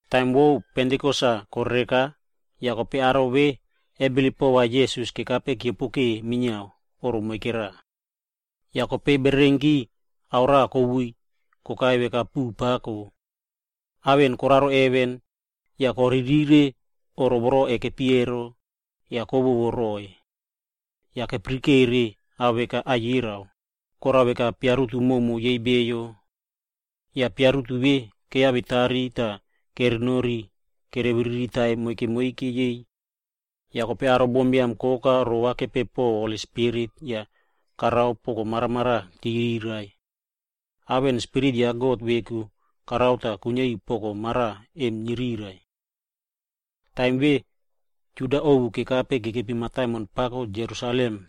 Taim vo Pentikos-aa korereka, yah aro vemona kebilip pova Jisas kekape tah keopoke minia oꞌro moike raꞌa. Yah kope bererenki, ao raꞌa kweꞌei kokai veka puꞌu pako. Ao emo koraro heven. Yah koririkire oꞌro vemona kekepi emo, yah inia kowowo roroiy. Yah kepirikere ao veka aikera, korao veka piarutu yei bio prumo. Yah piarutu vemona keyavetari yah kerenori kerebiriri taiy moike moike yei. Yah kope aro bombiam koka rovakepeu po Holi Spirit tah korao poko maramaraꞌa va chirai. Ao emo, Spirit ya God veku korao tah kuiniari poko mara vemona nirai. Taim vemona, aro Juda ovu kekape kekepi mataimon pako Jerusalem,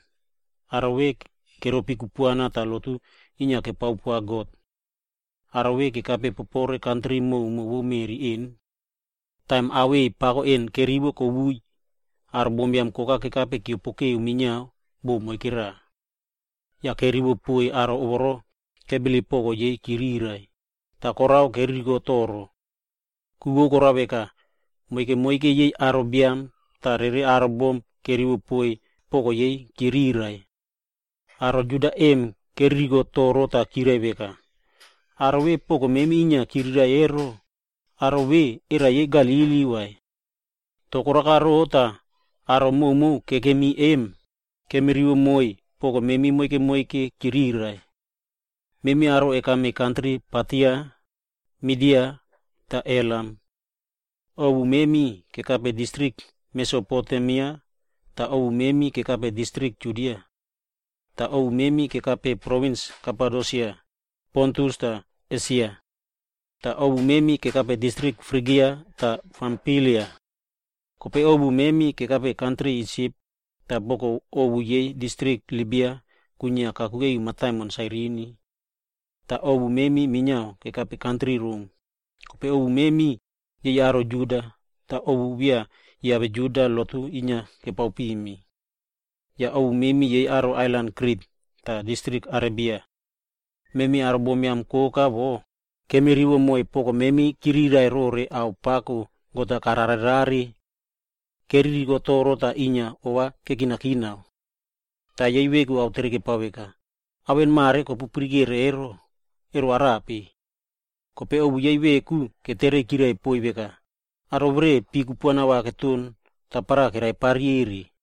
aro emo yei keropi kupuana tah lotu inia kepao pova God. Aro vemona kekape kantri prumo vo meꞌri vemo. Taim aweꞌei pako vemona kweꞌei, aro bombiam koka kekape keopokeu minia bo moike raꞌa. Yah kerivo poiy aro vemona kebilip ava chirai poko yei, tah korao keririko toro. Ku vo korao veka, moike moike yei aro biam tah rere aro bom kerivo poiy ava chirai poko yei. Aro Juda vemona keririko toro tah chirai veka, “Aro vemona poko memi inia chirai emo, era aro emo yei Galili unake vai? Korao veka rope tah memi aro koka kekemi vemo, awirai-a kemi rivo moiy chirai poko memi moike moike? Memi aro kekame kantri Partia, Midia re Elam. Yah ovu memi kekame distrik Mesopotemia yah ovu memi kekame distrik Judia. Yah ovu memi kekame provins Kapadosia, Pontus re Esia. Yah ovu memi kekape distrik Frigia re Pamfilia. Kope ovu memi kekape kantri Isip awere boko ovu vo distrik Libia kwinia kakuke ri mataimon Sairini. Yah ovu memi minia kekame kantri Rom, yah kope ovu memi, yei aro Juda, tah yei aro ovu beya kiave Juda ero lotu inia kepao pimi. Yah ovu memi aro yei ailan Krit re distrik Arebia. Memi aro bombiam koka vemona, awirai-a kemirivo moiy chirai poko memi rore ao ipipo God-a kararerare.” Keririko toro tah ova inia kekinakina po pako. Yah ketere yei veku veka, “Ao vemona mare kopuyara emo, ero arape?” Kope ovu yei veku ava chavo poiy yah chirai poiy veka, “Aro verenare pi kupuana keton tapara vere keraipari ere.”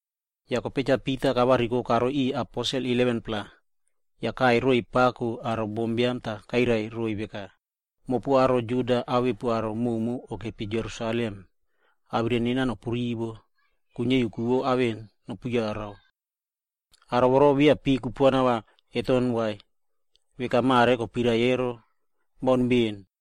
Yah kope Cha Pita kavariko karoi riꞌiy 11-pla aposel, tah kaꞌai pako roiy aro bombiam yah kairai roiy veka, “Mopu aro Juda awepu aro koka kokepi Jerusalem, awirai nena nopu rivo, yah kuiniari ku vo ao vemona nopu yara. Aro vemona beya pi kupuana keton vai, veka mare kopuirai emo, baun poaka.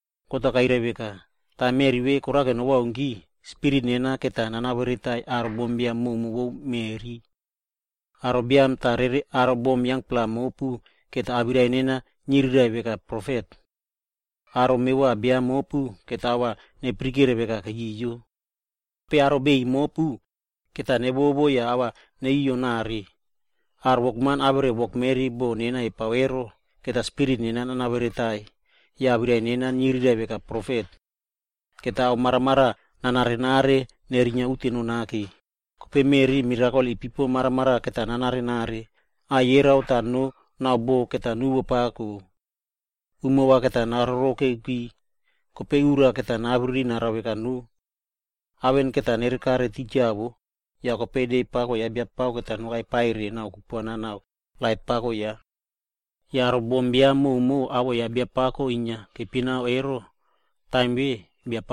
‘God-a kairai veka, “Taim meꞌri vemona korao nobaunki, Spirit nena va nanaveretai aro bombiam koka vo meꞌri. Aro mevova biam awere mevova bom mopu, va ava niriraiꞌvo veka profet. Aro biam yangpla mopu, va ava nepirikere veka keyoyo, Kope aro biꞌiy mopu, va nevovo yah ava neyoyo nare. Aro wokman tah wokmeri boꞌo nena kepao ero, va Spirit nena nanaveretai yah awirai nena niriraiꞌvo veka profet. Nena ao maramaraꞌa va nanare nerinia uteno nake, kope meꞌri pika va mirakol ipipo maramaraꞌa va nanarenare. Aikera re noo yah boho va nuwo pako. Umo va nakiyo, Kope ura va nabririna veka noo. Ao vemo va nere kare titja wo, yah kope de pako ya Biapako va nokai pa re kupuana yah lait ya. Yah aro bombiam koka voro awoꞌo ya Biapako inia kepinaka ero, Taim vemona,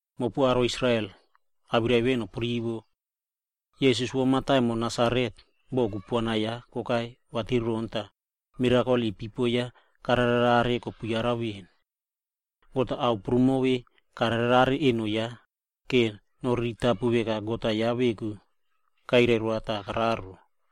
“Mopu aro Israel, awirai vemona nopu rivo. Jisas vo mataimon Nasaret, boꞌo kupuana ya kokai vatiron yah mirakol ipipo karare kopuyarare veꞌen. God-a ao prumo vemona kararerare eno ya vora noriritapu veka God-a veku kairai roa tah kararo.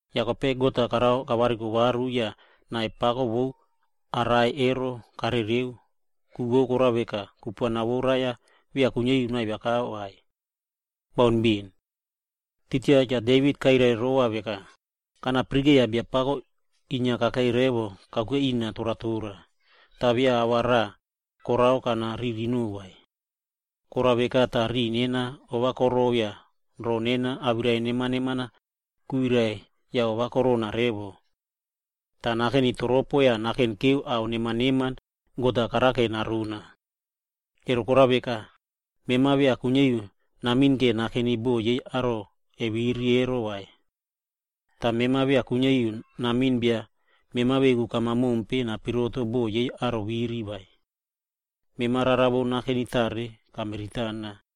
Yah kope God-a karao kavariko varu yah nai pako vo rai-a karereu, ku vo korao veka kupuana vo rai beya kuiniari noavia vai. Baun poaka! Titja Cha Devit kairai rova veka, ‘Kana yaraka Biapako inia kakei rina toratora revo kakuke tah beya ava raꞌa korao kanaririno vai. Korao veka tah riꞌi nena ovakoroꞌo yah roo nena awirai neman neman kwirai yah ovakorona poaka. Yah nena va nakeni toropo yah nakenikere pon ao neman God-a karao narina. Emo korao veka, mema beya kuiniari namiꞌin inia nakeni bo yei aro viri vai. Yah mema beya kuiniari namiꞌin bia mema veku kama mompe napiroto bo yei aro viri vai. Mema rara neman vo nakeni tare kamiritana,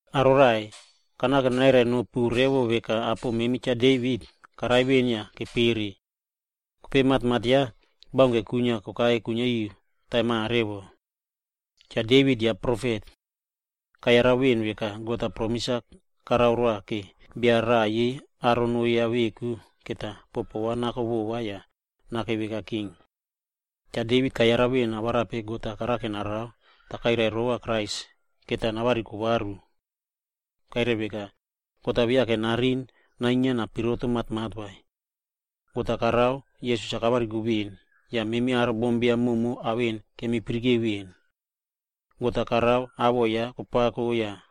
“Aro raꞌai, kanake nanairai nopu revo veka, apo memi Cha Devit, karai veꞌen yah kepere. Kope matmat ya, baunke kwinia kokai kuiniari taim mare. Cha Devit ya profet. Kayara veꞌen veka God-a promis-a karoa va bia raꞌa yei aro noo ya veku va boho ya nako rova yah nakei veka king. Cha Devit kayara veꞌen arape God-a karao narao, yah kope kairai rova Krais va kope navariko varu. Kairai veka, God-a beya kuiniari nariꞌin nainia yah napiroto matmat vai. God-a karao Jisas-a kavariko veꞌen, yah memi aro bombiam koka ao vemona kemi yara veꞌen. God-a karao awoꞌo ya kopako yah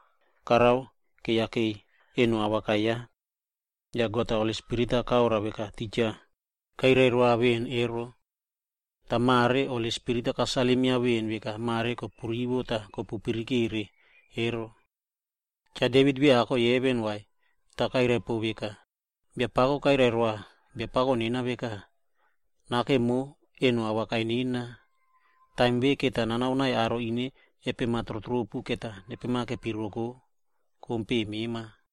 karao keyakei eno paraꞌa awaka ya. Yah Cha Taita God-a Holi Spirit-a karoa veka titja kairai roa veꞌen ero. Yah mare Holi Spirit-a kasalim veꞌen veka mare kopu rivo tah kopu yara ero. Cha Devit beya kakoi heven vai, tah vo kairai pon veka, ‘Biapako kairai roa Biapako nena veka, e “Nakemo eno paraꞌa awaka nena, Taim vemona va nanao aro birua mema va nepemakepiroko kompeꞌe mema.” ’”f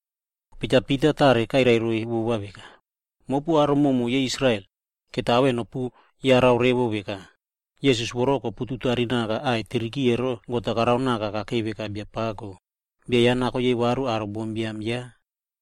Kope Cha Pita tare kairai roiy vova veka, “Mopu aro koka vo Israel, ao vemona va nopuyara revo veka, Jisas voro kopututarinaka kruse ero, God-a karao naka kakei veka Biapako, tah bia ya nako yei varu aro bombiam ya.”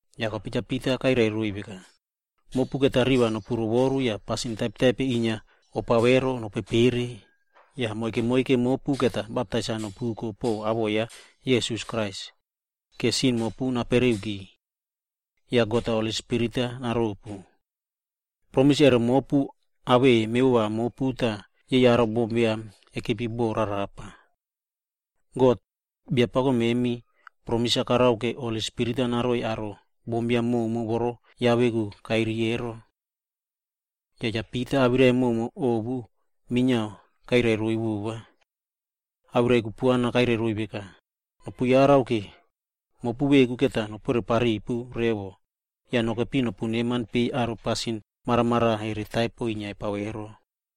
Yah kope Cha Pita kairai roiy veka, “Mopu va riva nopu rovoru yah pasin taipere kopare va nopepereki, yah mopu moike moike va baptais-a nopuko poꞌo awoꞌo ya Jisas Krais vora sin mopu napereki. Yah God-a va Holi Spirit-a naropu. Promis emo mopu awei mevova mopu na yei aro bombiam kekepi rarapa. God, Biapako memi kapromis va Holi Spirit-a naroi aro bombiam koka voro ya veku kairiy ero.” Yah Cha Pita awirai prumoki ovu minia kairai roiy. Yah awirai kupuana kairai roiy veka, “Ova nopu kinake, mopu nopore papipu revo mopu veku, vora nokepi nopu neman peiy aro pasin maramaraꞌa taipere inia kepare pare ero.”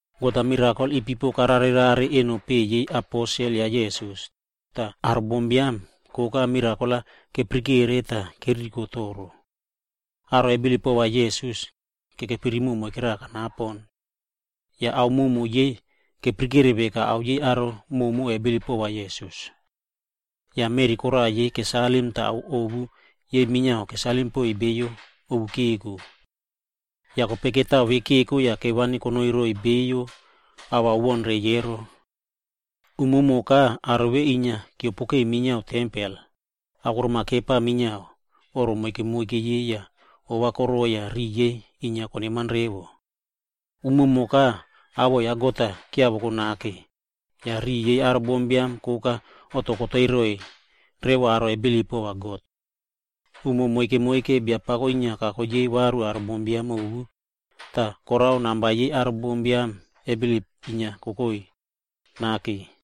God-a mirakol ipipo karare rare eno peꞌe yei aposel ya Jisas, yah aro bombiam koka mirakol-a kepirikere tah keririko toro. Aro kebilip pova Jisas, kekepi rimoꞌo moike raꞌa kanapo. Yah ao prumo yei keyarare veka ao yei aro koka kebilip pova Jisas. Yah meꞌri koraꞌa yei kesalim tah ao yei ovu minia kesalim rere poiy beyo ovu keko. Yah kope mani vemo keko yah kevani konoi roiy aro ava kere baun reiy ero. Umumoka aro vemona inia keopoke minia tempel, yah akorom-a kepa minia oꞌro moike moike yei tah ova koroꞌoi yah riꞌi yei inia koneman poaka. Umumoka awoꞌo ya God-a kiavoko nake, yah riꞌi yei aro bombiam koka oꞌto koteiy roiy revo aro kebilip pova God. Umo moike moike Biapako inia kako yei varu aro bombiam ovu, tah korao namba yei aro bombiam kebilip inia kokoi kopako.